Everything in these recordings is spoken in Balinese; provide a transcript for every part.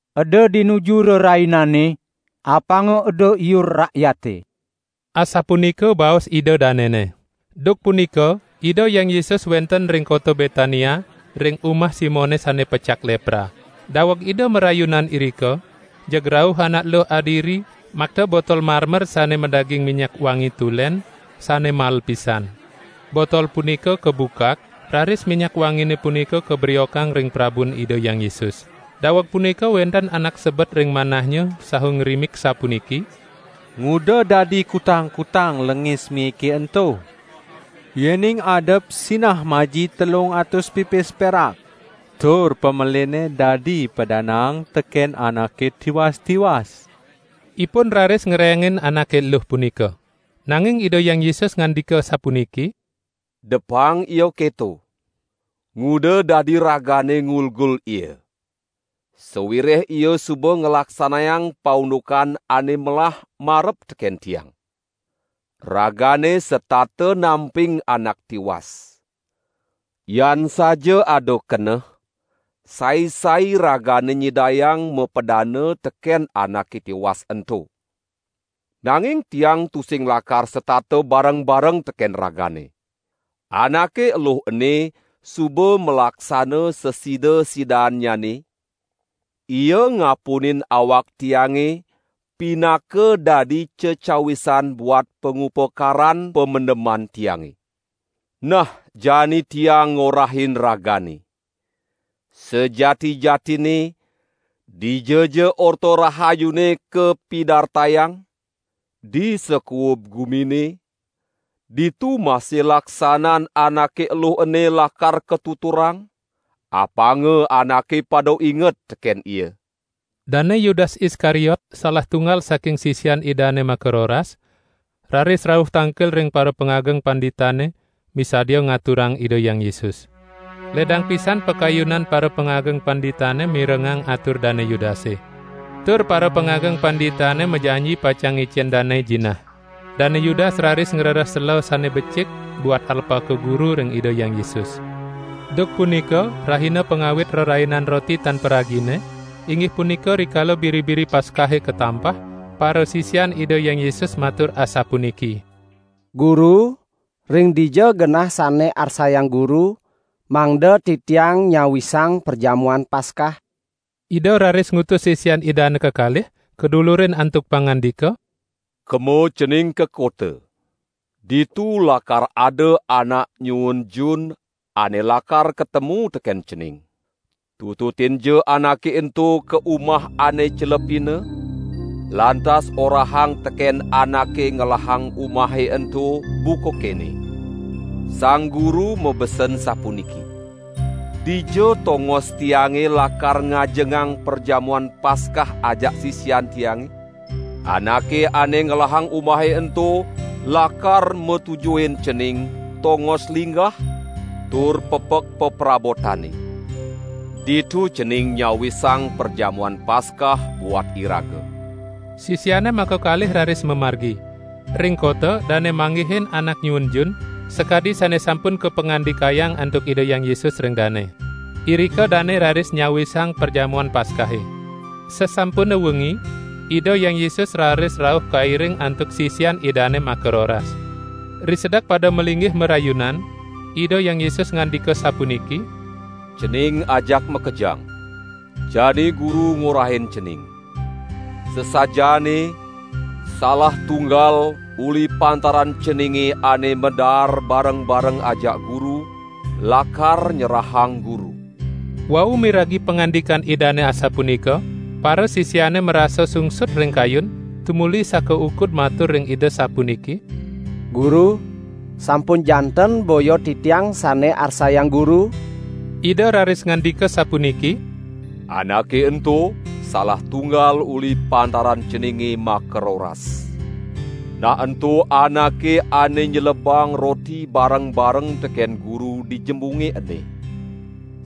"Eda dinuju rainane, apanga eda iur rakyate," asapunika baos ida danene. Duk punika Ida Hyang Yesus wenten ring kota Betania ring umah Simone sane pecak lepra. Daweg Ida marayunan irika, jeg rauh anak eluh adiri makta botol marmer sane madaging minyak wangi tulen sane mael pisan. Botol punika kabukak, raris minyak wangine punika kabriokang ring prabun Ida Hyang Yesus. Daweg punika wenten anak sebet ring manahnya saha ngrimik sapuniki: "Nguda dadi kutang-kutang lengis miike ento? Yening adep sinah maji telung atus pipis perak tur pamelinne dadi padanaang teken anake tiwas-tiwas." Ipun raris ngerengin anake eluh punika. Nanging Ida Hyang Yesus ngandika sapuniki: "Depang ia keto! Nguda dadi ragane ngulgul ia. Sawireh ia suba nglaksanayang paundukan ane melah marep teken Tiang. Ragane setata namping anak tiwas. Yan saja ada keneh, sai-sai ragane nyidayang mapadana teken anake tiwas ento! Nanging Tiang tusing lakar setata bareng-bareng teken ragane. Anake eluh ene suba malaksana sasida-sidaannyane, ia ngapunin awak Tiange pinaka dadi cecawisan buat pangupakaran pamendeman Tiange! Nah jani Tiang ngorahin ragane! Sajati-jatinne, dijaja Orta Rahayune kapidartayang, di sakuub gumine, ditu masih laksanan anake eluh ene lakar katuturang, apanga anake pada inget teken ia!" Dane Yudas Iskariot salah tunggal saking sisian Idane makaroras, raris rauh tangkil ring parapangageng panditane misadia ngaturang Ida Hyang Yesus. Ledang pisan pakayunan parapangageng panditane mirengang atur Dane Yudase. Tur parapangageng panditane majanji pacang ngicen dane jinah. Dane Yudas raris ngrereh sela sane becik buat alpaka guru ring Ida Hyang Yesus. Duk punika rahina pangawit Rerainan Roti Tan Paragine, inggih punika rikala biri-biri Paskahe katampah, parasisian Ida Hyang Yesus matur asapuniki: "Guru ring dija genah sane arsayang Guru, mangda titiang nyawisang Perjamuan Paskah?" Ida raris ngutus sisian Idane kekalih, kadulurin antuk pangandika: "Kema cening ka kota! Ditu lakar ada anak nyuun jun ane lakar katemu teken cening. Tututinja anake ento ka umah ane celepina, lantas orahang teken anake ngelahang umahe ento buka kene: 'Sang Guru mabesen sapuniki: Dija tongos Tiange lakar ngajengang Perjamuan Paskah ajak sisian Tiange?' Anake ane ngelahang umahe ento lakar matujuhin cening tongos linggah tur pepek peprabotane. Ditu cening nyawisang Perjamuan Paskah buat iraga!" Sisiane makakalih raris mamargi. Ring kota dane manggihin anak nyuun jun sakadi sane sampun kapangandikayang antuk Ida Hyang Yesus ring dane. Irika dane raris nyawisang Perjamuan Paskahe. Sasampune wengi, Ida Hyang Yesus raris rauh kairing antuk sisian Idane makaroras. Risedek pada malinggih marayunan, Ida Hyang Yesus ngandika sapuniki: "Cening ajak makejang! Jani Guru ngorahin cening: Sasajaane, salah tunggal uli pantaran ceninge ane madaar bareng-bareng ajak Guru, lakar nyerahang Guru!" Wau miragi pangandikan Idane asapunika, parasisiane marasa sungsut ring kayun tumuli sakaukud matur ring Ida sapuniki: "Guru, sampun janten boya titiang sane arsayang Guru?" Ida raris ngandika sapuniki: "Anake ento salah tunggal uli pantaran ceninge makaroras. Nah ento anake ane nyelebang roti bareng-bareng teken Guru di jembunge ene.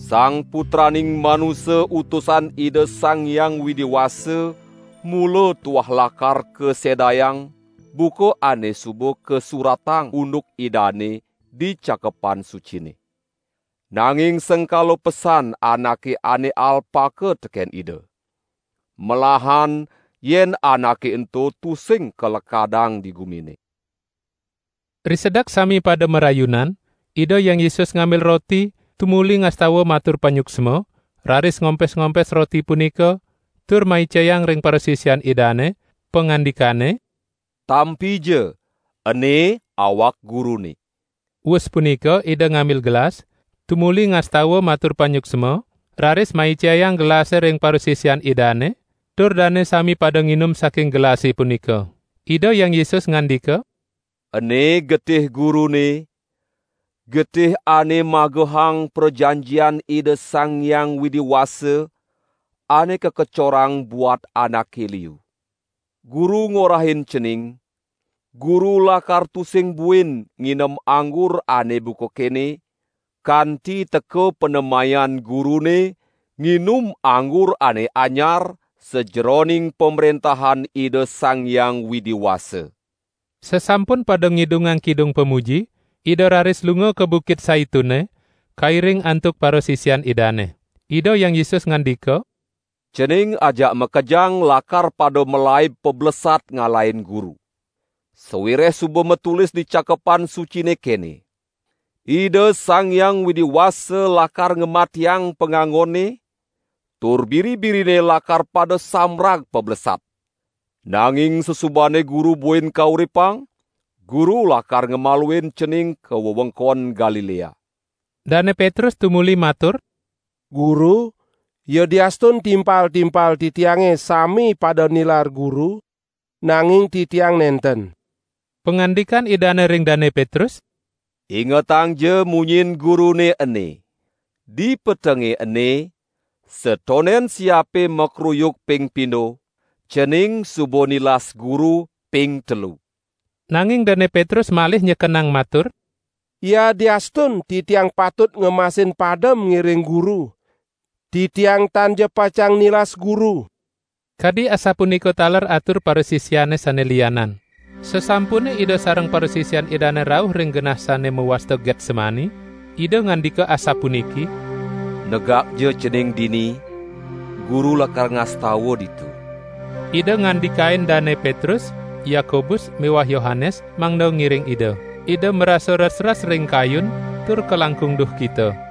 Sang Putraning Manusa Utusan Ida Sang Hyang Widi Wasa mula tuah lakar kasedayang buka ane suba kasuratang unduk Idane di Cakepan Sucine. Nanging sengkala pesan anake ane alpaka teken Ida. Melahan yen anake ento tusing kalekadang di gumine." Risedek sami pada marayunan, Ida Hyang Yesus ngambil roti, tumuli ngastawa matur panyuksma, raris ngompes-ngompes roti punika, tur maicayang ring parasisian Idane, pangandikane: "Tampija, ene awak Gurune!" Wus punika Ida ngambil gelas, tumuli ngastawa matur panyuksma, raris maicayang gelase ring parasisian Idane, tur dane sami pada nginum saking gelase punika. Ida Hyang Yesus ngandika: "Ene getih Gurune, getih ane magehang prajanjian Ida Sang Hyang Widi Wasa, ane kakecorang buat anake liu. Guru ngorahin cening, Guru lakar tusing buin nginem anggur ane buka kene, kanti teka panemayan Gurune nginum anggur ane anyar sajeroning Pamrentahan Ida Sang Hyang Widi Wasa." Sasampun pada ngidungang kidung pamuji, Ida raris lunga ka Bukit Saitune, kairing antuk parasisian Idane. Ida Hyang Yesus ngandika: "Cening ajak makejang lakar pada malaib pablesat ngalahin Guru. Sawireh suba matulis di Cakepan Sucine kene: 'Ida Sang Hyang Widi Wasa lakar ngamatiang pangangone, tur biri-birine lakar pada sambrag pablesat.' Nanging sasubane Guru buin kauripang, Guru lakar ngamaluin cening ka wewengkon Galilea." Dane Petrus tumuli matur: "Guru, yadiastun timpal-timpal titiange sami pada nilar Guru, nanging titiang nenten." Pangandikan Idane ring Dane Petrus: "Ingetangja munyin Gurune ene. Di petenge ene, satonden siape makruyuk ping pindo, cening suba nilas Guru ping telu." Nanging Dane Petrus malih nyekenang matur: "Yadiastun titiang patut ngemasin padem ngiring Guru, titiang tanja pacang nilas Guru!" Kadi asapunika taler atur parasisiane sane lianan. Sasampune Ida sareng parasisian Idane rauh ring genah sane mawasta Getsemani, Ida ngandika asapuniki: "Negakja cening dini, Guru lakar ngastawa ditu." Ida ngandikain Dane Petrus, Yakobus miwah Yohanes mangda ngiring Ida. Ida marasa resres ring kayun tur kalangkung duhkita.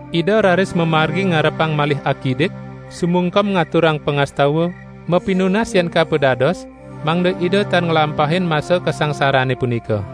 Ida raris mamargi ngarepang malih akidik, sumungkem ngaturang pangastawa, mapinunas yen kapo dados mangda Ida tan nglampahin masa kasangsarane punika.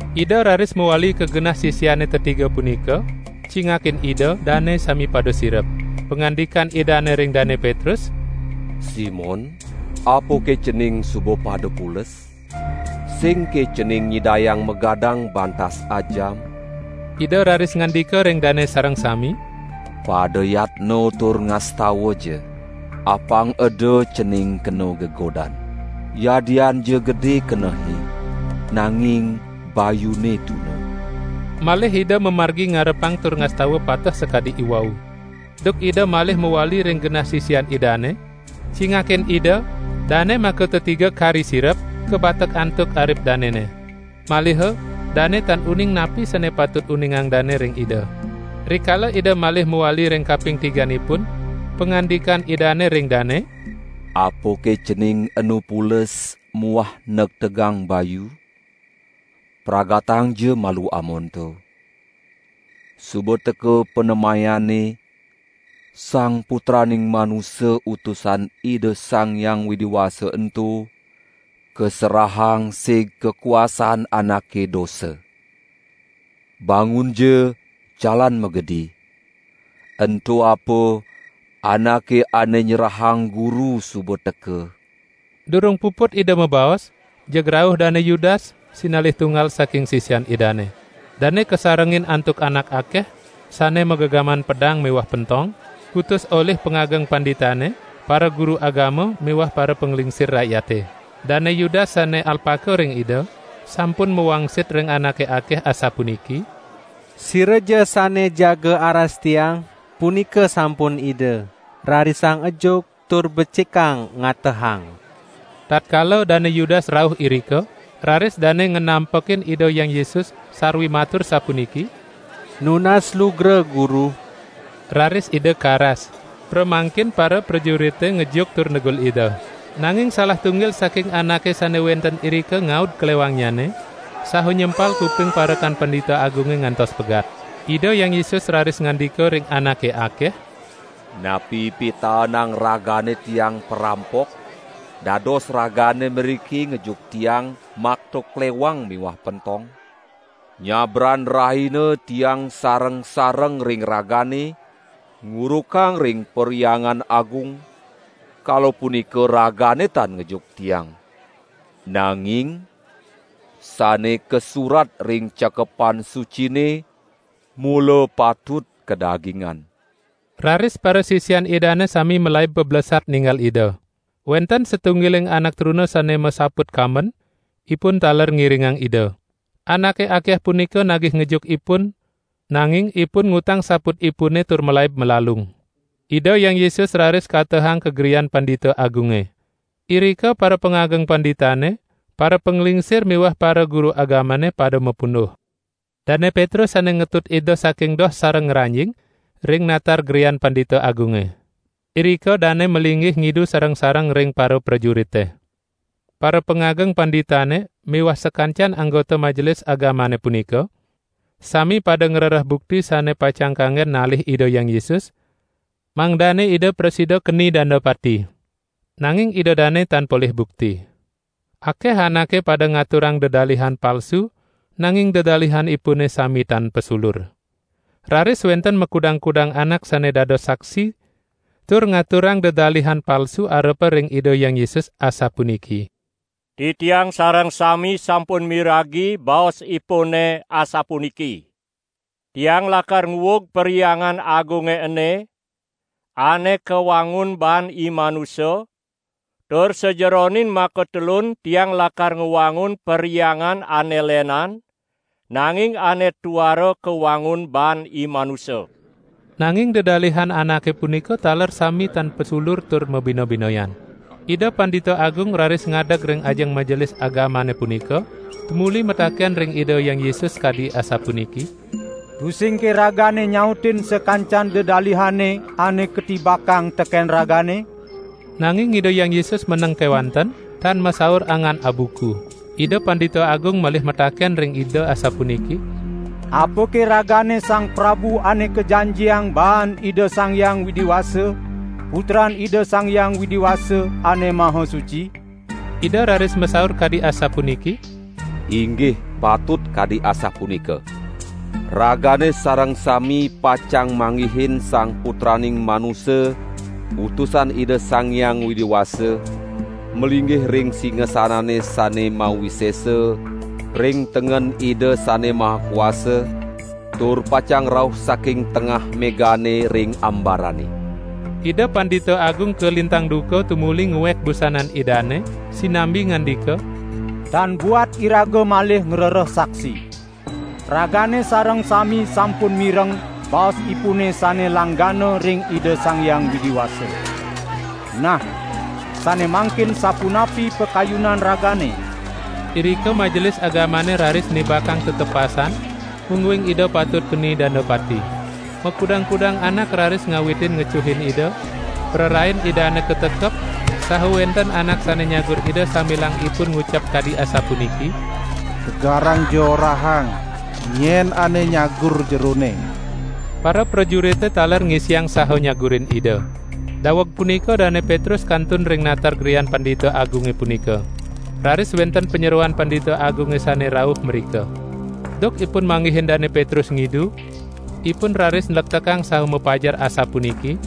Ida raris mawali ka genah sisiane tetiga punika, cingakin Ida dane sami pada sirep. Pangandikan Idane ring Dane Petrus: "Simon, apake cening suba pada pules? Singke cening nyidayang magadang bantas ajam?" Ida raris ngandika ring dane sareng sami: "Pada yatna tur ngastawaja, apang eda cening kena gegodan! Yadianja gede kenehe, nanging bayune tuna!" Malih Ida mamargi ngarepang tur ngastawa pateh sakadi iwau. Duk Ida malih mawali ring genah sisian Idane, cingakin Ida dane makatetiga kari sirep, kabatek antuk arip danene. Maliha dane tan uning napi sane patut uningang dane ring Ida. Rikala Ida malih mawali ring kaping tiganipun, pangandikan Idane ring dane: "Apake cening enu pules muah negtegang bayu? Pragatangja malu amonto! Suba teka panemayane Sang Putraning Manusa Utusan Ida Sang Hyang Widi Wasa ento kaserahang sig kakuasaan anake dosa. Bangunja jalan magedi! Ento apa anake ane nyerahang Guru suba teka!" Durung puput Ida mabaos, jeg rauh Dane Yudas, sinalih tunggal saking sisian Idane. Dane kasarengin antuk anak akeh, sane magegaman pedang miwah pentong, kutus olih pangageng panditane, paraguru agama miwah parapanglingsir rakyate. Dane Yudas sane alpaka ring Ida, sampun mawangsit ring anake akeh asapuniki: "Siraja sane jaga aras tiang, punika sampun Ida, rarisang ejuk tur becikang ngatehang!" Tatkala Dane Yudas rauh irika, raris dane nganampekin Ida Hyang Yesus sarwi matur sapuniki: "Nunas lugra Guru!" Raris Ida karas. Pramangkin paraprajurite ngejuk tur negul Ida. Nanging salah tunggil saking anake sane wenten irika ngaud klewangnyane, saha nyempal kuping parekan Pandita Agunge ngantos pegat. Ida Hyang Yesus raris ngandika ring anake akeh: "Napi pitaenang ragane Tiang parampok, dados ragane mriki ngejuk Tiang makta klewang miwah pentong? Nyabran rahina Tiang sareng-sareng ring ragane, ngurukang ring Perhyangan Agung, kala punika ragane tan ngejuk Tiang. Nanging sane kasurat ring Cakepan Sucine mula patut kadagingan!" Raris parasisian Idane sami malaib pablesat ninggal Ida. Wenten satunggiling anak truna sane masaput kamben, ipun taler ngiringang Ida. Anake akeh punika nagih ngejuk ipun, nanging ipun ngutang saputipune tur malaib malalung. Ida Hyang Yesus raris katehang ka grian Pandita Agunge. Irika parapangageng panditane, parapanglingsir miwah paraguru agamane pada mapunduh. Dane Petrus sane ngetut Ida saking doh sareng ngranjing ring natar grian Pandita Agunge. Irika dane malinggih ngidu sareng-sareng ring paraprajurite. Parapangageng panditane miwah sakancan anggota Majelis Agamane punika, sami pada ngrereh bukti sane pacang kanggen nalih Ida Hyang Yesus, mangdane Ida prasida keni danda pati. Nanging Ida dane tan polih bukti. Akeh anake pada ngaturang dedalihan palsu nanging dedalihanipune sami tan pasulur. Raris wenten makudang-kudang anak sane dados saksi tur ngaturang dedalihan palsu arepa ring Ida Hyang Yesus asapuniki: "Titiang sareng sami sampun miragi baos Ipune asapuniki: 'Tiang lakar nguug Perhyangan Agunge ene, ane kawangun baan imanusa, tur sajeroning makatelun Tiang lakar ngwangun Perhyangan ane lenan, nanging ane tuara kawangun baan imanusa.' " Nanging dedalihan anake punika taler sami tan pasulur tur mabina-binayan. Ida Pandita Agung raris ngadeg ring ajeng Majelis Agamane punika, tumuli mataken ring Ida Hyang Yesus kadi asapuniki: "Tusingke Ragane nyautin sakancan dedalihane ane katibakang teken Ragane?" Nanging Ida Hyang Yesus meneng kewanten, tan masaur angan abuku. Ida Pandita Agung malih mataken ring Ida asapuniki: "Apake Ragane Sang Prabu Ane Kajanjiang baan Ida Sang Hyang Widi Wasa, Putran Ida Sang Hyang Widi Wasa Ane Maha Suci?" Ida raris masaur kadi asapuniki: "Inggih patut kadi asapunika. Ragane sareng sami pacang manggihin Sang Putraning Manusa Utusan Ida Sang Hyang Widi Wasa malinggih ring singasanane sane mawisesa ring tengen Ida Sane Maha Kuasa tur pacang rauh saking tengah megane ring ambarane!" Ida Pandita Agung kalintang duka tumuli nguek busanan Idane, sinambi ngandika: "Tan buat iraga malih ngrereh saksi! Ragane sareng sami sampun mireng baos Ipune sane langgana ring Ida Sang Hyang Widi Wasa! Nah, sane mangkin sapunapi pakayunan ragane?" Irika Majelis Agamane raris nibakang tetepasan, mungguing Ida patut keni danda pati. Makudang-kudang anak raris ngawitin ngecuhin Ida, prarain Idane katekep saha wenten anak sane nyagur Ida sambilang ipun ngucap kadi asapuniki: "Tegarangja orahang, nyen ane nyagur Jerone!" Paraprajurite taler ngisiang saha nyagurin Ida. Daweg punika Dane Petrus kantun ring natar grian Pandita Agunge punika. Raris wenten panyeroan Pandita Agunge sane rauh mrika. Duk ipun manggihin Dane Petrus ngidu, ipun raris nlektekang saha mapajar asapuniki: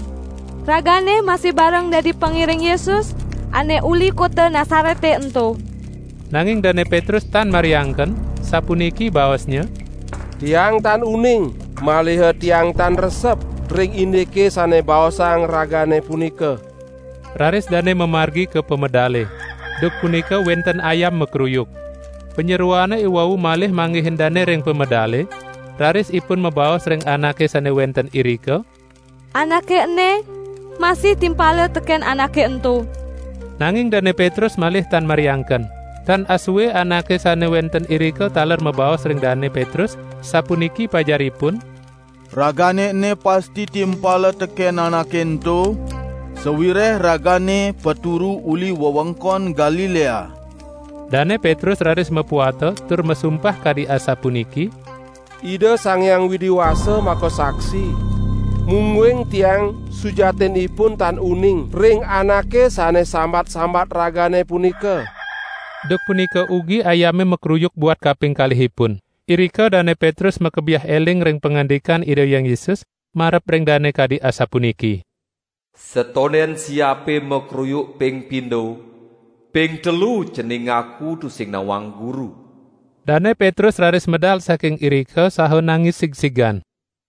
"Ragane masih bareng dadi pangiring Yesus ane uli kota Nasarete ento!" Nanging Dane Petrus tan mariangken, sapuniki baosnya: "Tiang tan uning, maliha tiang tan resep ring indike sane baosang ragane punika." Raris dane mamargi ka pamedale; duk punika wenten ayam makruyuk. Panyeroan iwau malih manggihin dane ring pamedale raris ipun mabaos ring anake sane wenten irika: "Anake ene masih timpala teken Anake ento!" Nanging Dane Petrus malih tan mariangken. Tan asue anake sane wenten irika taler mabaos ring Dane Petrus, sapuniki pajaripun: "Ragane ene pasti timpala teken Anake ento, sawireh ragane paturu uli wewengkon Galilea." Dane Petrus raris mapuata tur masumpah kadi asapuniki: "Ida Sang Hyang Widi Wasa makasaksi, mungguing tiang sujatinipun tan uning ring Anake sane sambat-sambat ragane punika!" Duk punika ugi ayame makruyuk buat kaping kalihipun. Irika Dane Petrus makebiah eling ring pangandikan Ida Hyang Yesus marep ring dane kadi asapuniki: "Satonden siape makruyuk ping pindo, ping telu cening ngaku tusing nawang Guru." Dane Petrus raris medal saking irika saha nangis sigsigan.